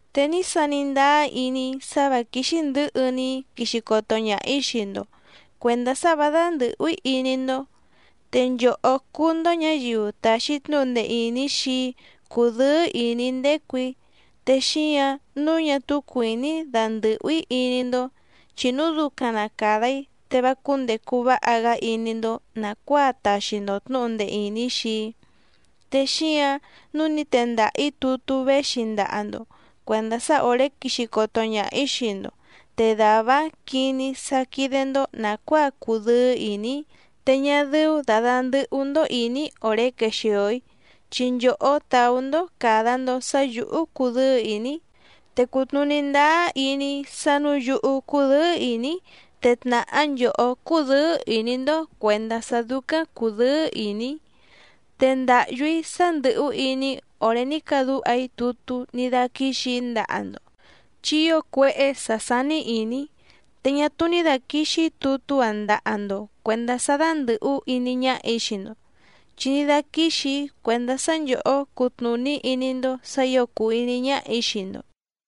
Te ní sani ndáá iní‑í sá vǎ quíxí ndɨ̌hɨ‑ni‑í quixi coto ñaha‑ǐ xii‑ndo cuèndá sá vǎ dándɨ̀hú‑í iní‑ndó. Te nchòhó cúú‑ndó ñǎyiu tàxi tnúhu ndee ìní xii‑í cúdɨ̌ɨ́ ìní‑í ndécù‑í, te xíǎⁿ nǔu ñá túú cuìní‑í dandɨ̀hú‑í iní‑ndó, chi núu ducaⁿ na càda‑í te vá cúndècu váha‑gá iní‑ndó nàcuáa taxi‑ndo tnǔhu ndee ìní xii‑í. Te xíǎⁿ nǔu ní tendaha‑ǐ tutú véxi ndaha‑ndo cuèndá sá òré quixi coto ñaha‑ǐ xii‑ndo, te dàvá‑áⁿ quiní‑í sá quídé‑ndó nàcuáa cudɨ́ɨ́ ìní‑í te ñá dɨ́ú dà dandɨhú‑ndó ìní‑í òré quexìo‑í, chi nchòhó tàú‑ndó càda‑ndo sá yǔhú cudɨ́ɨ́ ìní‑í. Te cùtnuní ndáá iní‑í sá nǔu yúhú cúdɨ̌ɨ́ ìní‑í te tnàhá nchòhó cúdɨ̌ɨ́ ìní‑ndó cuèndá sá dúcáⁿ cùdɨ́ɨ́ ìní‑í. Te ndàhyú‑í sá ndɨ̀hú iní‑í òré ní cadúha‑í tutú ní dáquíxì‑í ndaha‑ndo, chi ío cuéhé sǎ sání ìní‑í, te ñá túú ní dàquixi‑í tutú‑áⁿ ndaha‑ndo cuèndá sá dándɨ̀hú iní ñáhà‑í xii‑ndo, chi ní dáquíxì‑í cuèndá sá nchòhó cutnùní iní‑ndó sǎ ǐo cùu iní ñáhà‑í xii‑ndo.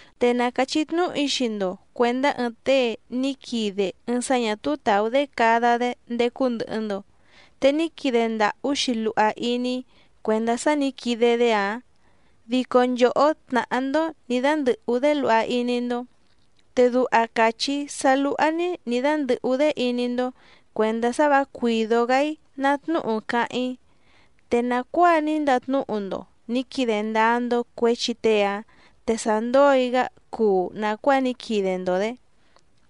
Te na càchí tnúhu‑í xii‑ndo cuèndá ɨɨⁿ tée ní quide ɨɨⁿ sá ñà túú tàú‑dé cada‑dé ndécú ndɨ̀hɨ‑ndo, te ní quide ndàhú‑xi luha iní‑í cuèndá sá nǐ quide‑dé‑áⁿ dico nchòhó tnàhá‑ndó nǐ dándɨ̀hú‑dé luha iní‑ndó, te duha càchí‑í sá lúhá‑ní nǐ dándɨ̀hú‑dé iní‑ndó cuèndá sá vǎ cuìdó‑gá‑í ná tnúhu cáháⁿ‑í. Te nàcuáa ní ndatnúhu‑ndo nǐ quide ndáá‑ndó cuěchi tée‑áⁿ te sa ndói‑gá cuu nàcuáa ní quide‑ndo‑dě.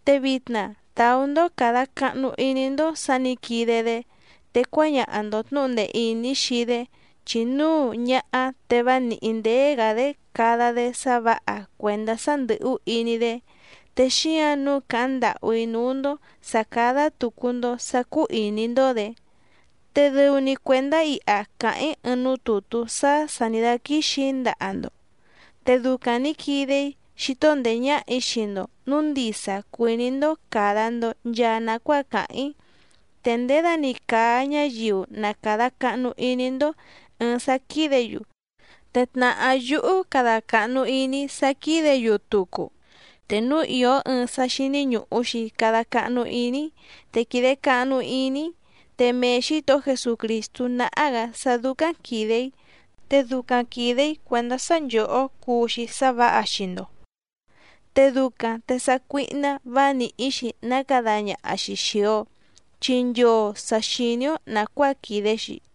Te vitna tàú‑ndó càda cahnu iní‑ndó sǎ nǐ quide‑dé, te cuáñaha‑ndo tnǔhu ndee ìní xii‑dé chi núu ñáhá te vá nìhí ndéé‑gǎ‑dé cada‑dé sá vǎha cuèndá sá ndɨ̀hú iní‑dé. Te xíǎⁿ nǔu càháⁿ ndàhú‑í núú‑ndó sǎ cádá tùcu‑ndo sá cúú ìní‑ndó‑dě. Te dɨu‑ni cuèndá iha càháⁿ‑í ɨɨⁿ núú tùtú sá sà ní dáquíxì‑í ndaha‑ndo, te ducaⁿ nǐ quide‑í xító ndèé ñáhà‑í xii‑ndo nǔu ndisa cuìní‑ndó càda‑ndo nchaa nacuáa càháⁿ‑í. Te nděda‑ni càa ñáyiu na càda cahnu iní‑ndó ɨ̀ɨⁿ sá quídě‑yu, te tnàhá yúhú cada càhnu iní‑í sá quídě‑yu tucu. Te núu ìó ɨɨⁿ sá xíní ñùhu‑xi cada cahnu iní‑í te quìde cahnu iní‑í, te mee Xǐtohó Jesucrìstú náhá‑gǎ sá dúcáⁿ quìde‑í, te ducaⁿ quìde‑í cuèndá sá nchòhó cuu‑xi sá vǎha xii‑ndo. Te ducaⁿ te sácuíhná vǎ nìhí‑xi ná cada ñaha‑xi xìi‑o, chi nchoo sà xiní‑ó nàcuáa quìde‑xi.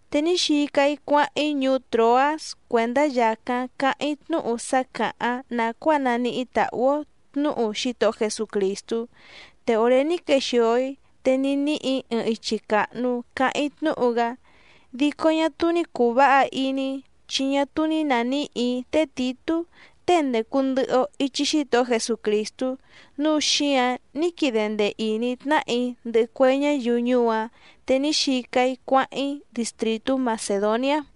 Te ní xica‑í cuáháⁿ‑í ñuú Tròás cuèndá yàcáⁿ cáháⁿ‑í tnúhu sá càháⁿ nàcuáa naníhí tàhú‑ó tnǔhu Xítohó Jesucrìstú, te òré ní quexìo‑í te ní níhì‑í ɨɨⁿ ichi càhnu cáháⁿ‑í tnúhu‑gá. Dico ñá túú ní cùu váha iní‑í chi ñá túú ní nàníhì‑í té Tìtú tée ndècu ndɨhɨ‑o ichi Xítohó Jesucrìstú, núu xíǎⁿ ní quide ndee ìní tnáhà‑í ndɨhɨ cue ñáyiu ñuú‑áⁿ, te ní xica‑í cuáháⁿ‑í distrìtú Macèdoniá.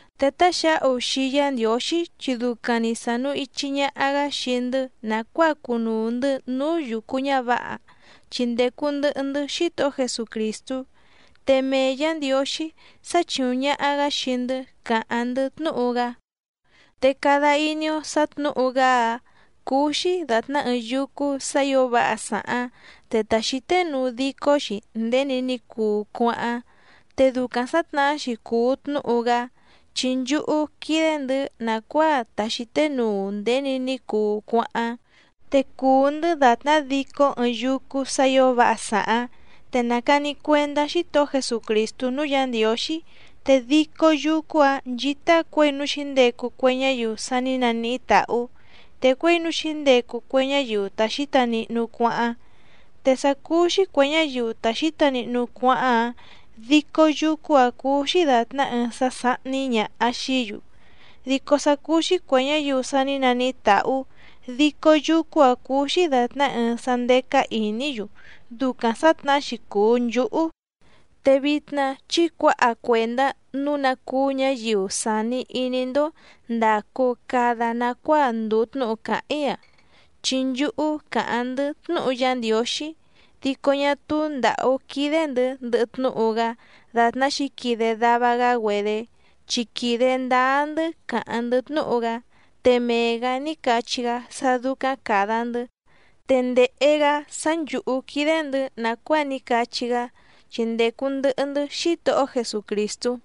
Te táxǎhu xii Yá Ndiǒxí chi ducaⁿ‑ni sànu ichi ñaha‑gá xii‑ndɨ́ nàcuáa cunuu‑ndɨ̌ núú yucu ñǎvǎha chi ndècu ndɨhɨ‑ndɨ́ Xítohó Jesucrìstú, te mee Yǎ Ndiǒxí sáchìuⁿ ñaha‑gá xii‑ndɨ́ càháⁿ‑ndɨ́ tnúhu‑gá. Te cada iní‑ó sǎ tnǔhu‑gá‑áⁿ cúú‑xí dàtná ɨɨⁿ yúcú sǎ ǐo váha sàháⁿ te ta xǐténuu dicó‑xi nděni ní cuu cuáháⁿ. Te ducaⁿ sǎtnahá‑xi cùu tnúhu‑gá chi nchúhú quídé‑ndɨ̌ nàcuáa ta xǐténuu nděni ní cuu cuáháⁿ. Te cùu‑ndɨ́ dàtná dicó ɨɨⁿ yúcú sǎ ǐo váha sàháⁿ, te nàcani cuendá Xítohó Jesucrìstú núú Yǎ Ndiǒxí, te dicó yúcú‑ǎⁿ nchítá cuěi núú xǐndecu cue ñáyiu sa ní naníhí tàhú, te cuěi núú xǐndecu cue ñáyiu ta xǐta nihnu cuáháⁿ. Te sá cúú‑xí cuè ñáyiu ta xǐta nihnu cuáháⁿ‑áⁿ, dicó yúcú‑ǎⁿ cúú‑xí dàtná ɨɨⁿ sá sáhní ñàha xií‑yu, dico sá cúú‑xí cuè ñáyiu sa ní naníhí tàhú, dicó yúcú‑ǎⁿ cúú‑xí dàtná ɨɨⁿ sá ndécá ìní‑yu, ducaⁿ sǎtnahá‑xi cùu nchúhú. Te vitna chí cuǎha cuèndá nǔu ná cúú ñǎyiu sàni iní‑ndó ndàcu cada nacuáa ndùu tnúhu càháⁿ‑í‑a. Chi nchúhú càháⁿ‑ndɨ́ tnúhu Yá Ndiǒxí dico ñá túú ndǎhú quídé‑ndɨ̌ ndɨhɨ tnúhu‑gá dàtná xǐquide dava‑gá‑güedé, chi quìde ndáá‑ndɨ́ càháⁿ‑ndɨ́ tnúhu‑gá, te mee‑gǎ ní cachí‑gá sá dúcáⁿ càda‑ndɨ́ te ndèhe‑gá sá nchǔhú quídé‑ndɨ̌ nàcuáa ní cachí‑gá, chi ndècu ndɨhɨ‑ndɨ́ Xítohó Jesucrìstú.